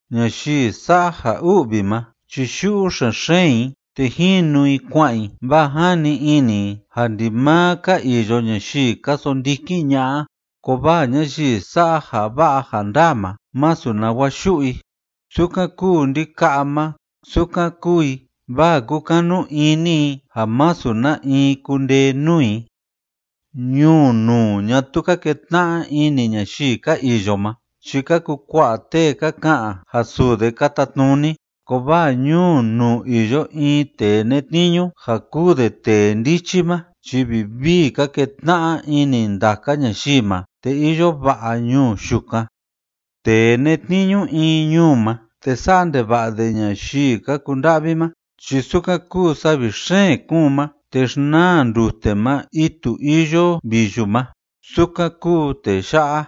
Ñayii sa'a ja u'vi ma chi yu'u xen‑xeen i te jinu i kua'an i, vaa jani ini i ja ndimaa ka iyo ñayii ka sondikin ña'a, kovaa ñayii sa'a ja va'a ja ndaa ma masu nawa yu'u i, sukan kúu ndika'a ma sukan kúu i, vaa kúkanu ini i ja masu na in kundee nuu i. Ñuu nuu ñatuu ka ketna'a ini ñayii ka iyo ma chi ka kukua'a tee ka ka'an ja suu de ka tatnuni, kovaa ñuu nuu iyo in tee netniñu ja kúu de tee ndichi ma, chi vivii ka ketna'a ini ndaka ñayii ma, te iyo va'a ñuu yukan. Tee netniñu in ñuu ma te sa'a ndeva'a de ñayii ka kunda'vi ma chi sukan kúu savi xeen kúun ma te xnaa ndute ma itu iyo viyu ma, sukan kúu tee ya'a.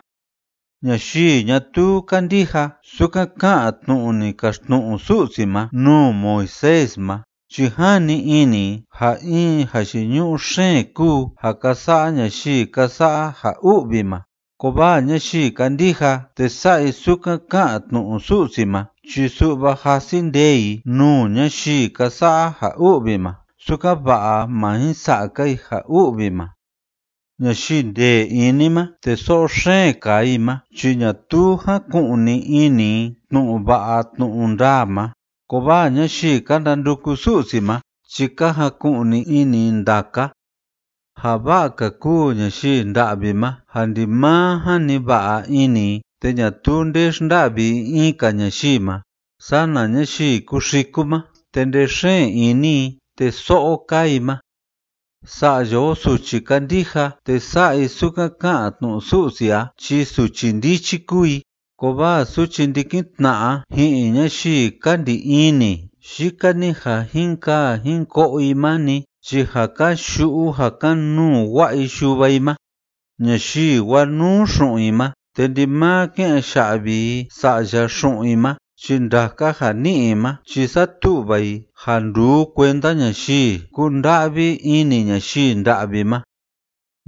Ñayii ñatuu kándija sukan ká'an tnu'u ni kaxtnu'u Su'si ma nuu Moisés ma chi jani ini i ja in jayiñu'u xeen kúu ja ka sa'a ñayii ka sa'a ja u'vi ma, kovaa ñayii kándija te sa'a i sukan ká'an tnu'u Su'si ma chi su'va jasi ndee i nuu ñayii ka sa'a ja u'vi ma sukan‑va'a má jin sa'a‑ka i ja u'vi ma. Ñayii ndee ini ma te so'o xeen kaa i ma chi ñatuu jaku'ni ini i tnu'u va'a tnu'u ndaa ma, kovaa ñayii ka ndanduku Su'si ma chi ka jaku'ni ini i ndaka. Ja va'a‑ka kúu ñayii nda'vi ma ja ndimaa jani va'a ini i te ñatuu nde xnda'vi i in‑ka ñayii ma sana ñayii kúxiku ma te ndee xeen ini i te so'o kaa i ma. Sa'ya o suchi kándija te sa'a i sukan ká'an tnu'u Su'si a chi suchi ndichi kúu i, kovaa suchi ndikin tna'a ji'in ñayii ka ndi ini yika‑ni ja jin kaa jin ko'o i ma‑ni chi ja kan‑yu'u ja kan‑nuu wa'a i yuva i ma. Ñayii wanuu xu'un i ma te ndimaa ké'en ya'vi‑ka i sa'ya xu'un i ma chi ndaka ja ni'i i ma chi satu'va i ja nduu kuenda ñayii kúnda'vi ini ñayii nda'vi ma.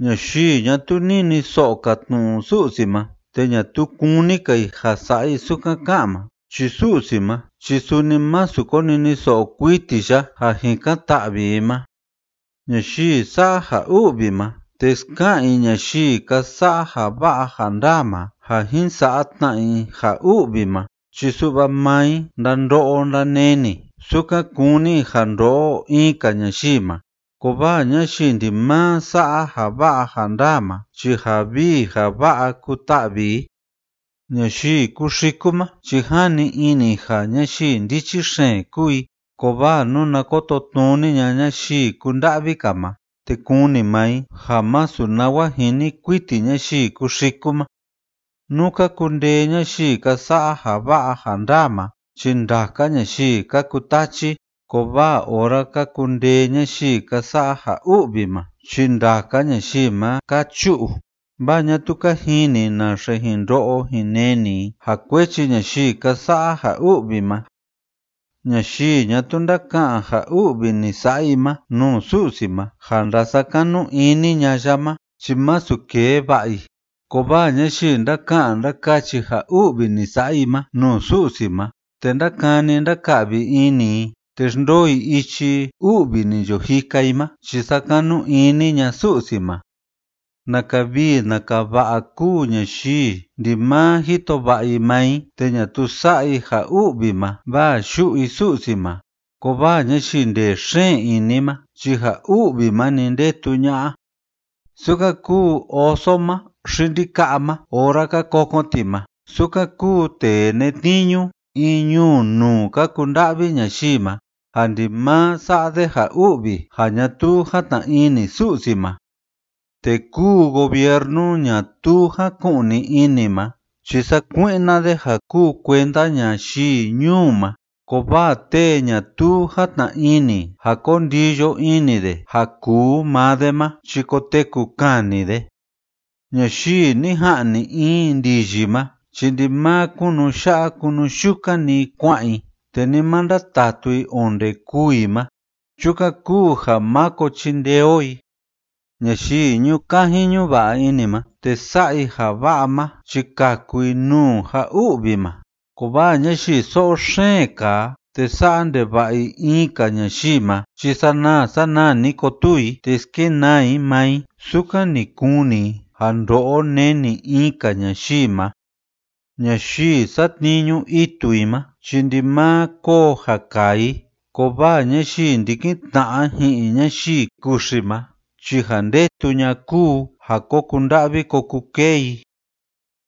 Ñayii ñatuu niniso'o‑ka tnu'u Su'si ma te ñatuu kúni‑ka i ja sa'a i sukan ká'an ma chi Su'si ma chi suni masu koniniso'o kuiti ya ja jikan‑ta'vi i ma. Ñayii sa'a ja u'vi ma te ska'an i ñayii ka sa'a ja va'a ja ndaa ma ja jin sa'a tna i ja u'vi ma chi su'va maa i ndando'o ndaneni sukan kúni i ja ndo'o in‑ka ñayii ma. Kovaa ñayii ndimaa sa'a ja va'a ja ndaa ma chi ja vii ja va'a kuta'vi i. Ñayii kúxiku ma chi jani ini i ja ñayii ndichi xeen kúu i, kovaa nuna kototnuni ña'a ñayii kúnda'vi‑ka ma te kuni maa i ja masu nawa jini kuiti ñayii kúxiku ma. Nú ka kundee ñayii ka sa'a ja va'a ja ndaa ma chi ndaka ñayii ka kutachi, kovaa ora ka kundee ñayii ka sa'a ja u'vi ma chi ndaka ñayii ma ka chu'u, vaa ñatuu ka jini i naxe jin ndo'o jin neni i ja kuechi ñayii ka sa'a ja u'vi ma. Ñayii ñatuu ndáka'an ja u'vi ni sa'a i ma nuu Su'si ma ja ndasakanu ini ña'a ya ma chi masu kee va'a i, kovaa ñayii ndáka'an ndákachi ja u'vi ni sa'a i ma nuu Su'si ma te ndákani ndáka'vi ini i te xndoo i ichi u'vi ni yo jika i ma chi sakanu ini ña'a Su'si ma. Naka vii naka va'a kúu ñayii ndimaa jito va'a i maa i te ñatuu sa'a i ja u'vi ma vaa yu'u i Su'si ma, kovaa ñayii ndee xeen ini ma chi ja u'vi ma‑ni ndetu ña'a. Sukan kúu oso ma xi ndika'a ma ora ka kokon ti ma, sukan kúu tee netniñu in ñuu nuu ka kunda'vi ñayii ma, ja ndimaa sa'a de ja u'vi ja ñatuu játna ini Su'si ma. Tee kúu gobiernu ñatuu jáku'ni ini ma chi sakui'na de ja kúu kuenda ñayii ñuu ma, kovaa tee ñatuu játna ini ja ko ndiyo ini de ja kuu maa de ma chi koteku kani de. Ñayii ni ja'ni in ndiyi ma chi ndimaa kunu ya'a kunu yukan‑ni i kua'an i, te ni ma ndatatu i onde kûu i ma. Chukan kúu ja máko chindee o i. Ñayii ñu'u kaji ñu'u va'a ini ma te sa'a i ja va'a ma chi kaku i nuu ja u'vi ma, kovaa ñayii so'o xeen kaa te sa'a ndeva'a i in‑ka ñayii ma chi sanaa sanaa‑ni kotuu i te skenaa i maa i sukan ni kuni i ja ndo'o neni in‑ka ñayii ma. Ñayii satniñu itu i ma chi ndimaa koo ja kaa i, kovaa ñayii ndikin tna'a ji'in ñayii kuxi ma chi ja ndetu ña'a kúu ja ko kunda'vi ko kukee i.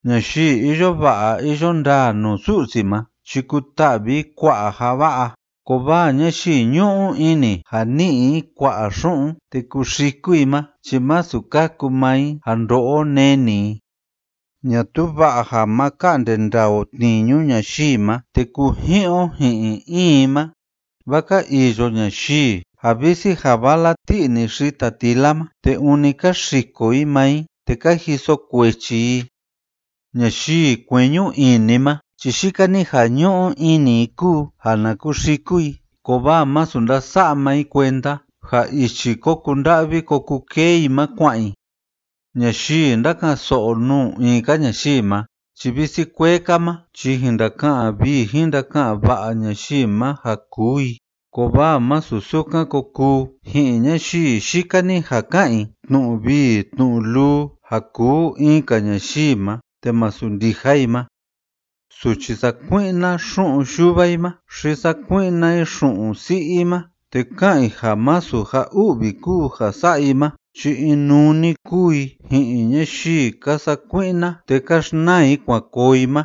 Ñayii iyo va'a iyo ndaa nuu Su'si ma chi kuta'vi i kua'a ja va'a, kovaa ñayii ñu'u ini ja ni'i i kua'a xu'un te kuxiku i ma chi masu kaku maa i ja ndo'o neni i. Ñatuu va'a ja ma ka'nde ndaa o tniñu ñayii ma te kuji'in o ji'in in i ma, vaa ka iyo ñayii ja visi ja vala ti'i‑ni xita tila ma, te ûni ka xiko i maa i te ka jiso kuechi i. Ñayii kueñu ini ma chi yika‑ni ja ñu'u ini i kúu ja na kuxiku i, kovaa masu ndasa'a maa i kuenda ja ichi ko kunda'vi ko kukee i ma kua'an i. Ñayii ndáka'an‑so'o nuu in‑ka ñayii ma chi visi kuee‑ka ma chi jin ndaka'an vii jin ndaka'an va'a ñayii ma ja kuu i, kovaa masu sukan ko kuu ji'in ñayii yika‑ni ja ka'an i tnu'u vii tnu'u luu ja kuu in‑ka ñayii ma te masu ndija i ma. Suchi sakui'na xu'un yuva i ma xi sakui'na i xu'un si'i i ma te ká'an i ja masu ja u'vi kúu ja sa'a i ma chi inuu‑ni kúu i ji'in ñayii ka sakui'na te ka xnaa i kuan koo i ma.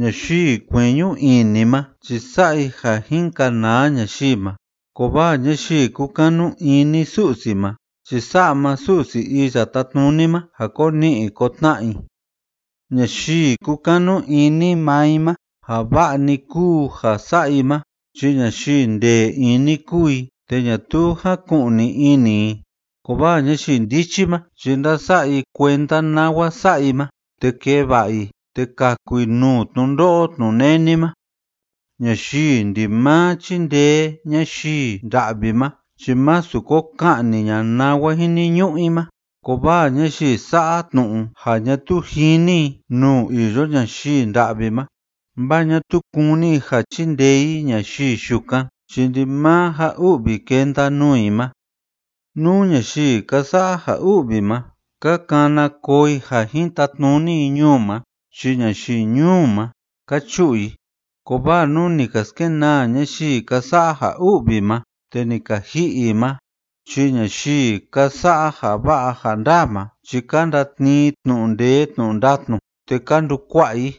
Ñayii kueñu ini ma chi sa'a i ja jin kanaa ñayii ma, kovaa ñayii kúkanu ini Su'si ma chi sa'a maa Su'si Iya Tátnuni ma ja ko ni'i ko tna'a i. Ñayii kúkanu ini maa i ma ja va'a‑ni kúu ja sa'a i ma chi ñayii ndee ini kúu i te ñatuu jáku'ni ini i, kovaa ñayii ndichi ma chi ndása'a i kuenda nawa sa'a i ma, te kee va'a i te kaku i nuu tnundo'o tnuneni ma. Ñayii ndimaa chíndee ñayii nda'vi ma chi másu ko ka'ni ña'a nawa jiniñu'u i ma, kovaa ñayii sa'a tnu'u ja ñatuu jini i nuu iyo ñayii nda'vi ma vaa ñatuu kúni i ja chindee i ñayii yukan chi ndimaa ja u'vi kenda nuu i ma. Nú ñayii ka sa'a ja u'vi ma, ka kana koo i ja jin tatnuni i ñuu ma chi ñayii ñuu ma, ka chu'u i, kovaa nú ni ka skenaa ñayii ka sa'a ja u'vi ma te ni ka ji'i i ma chi ñayii ka sa'a ja va'a ja ndaa ma chi ka ndatnii i tnu'u ndee tnu'u ndatnu te ka ndukua'a i.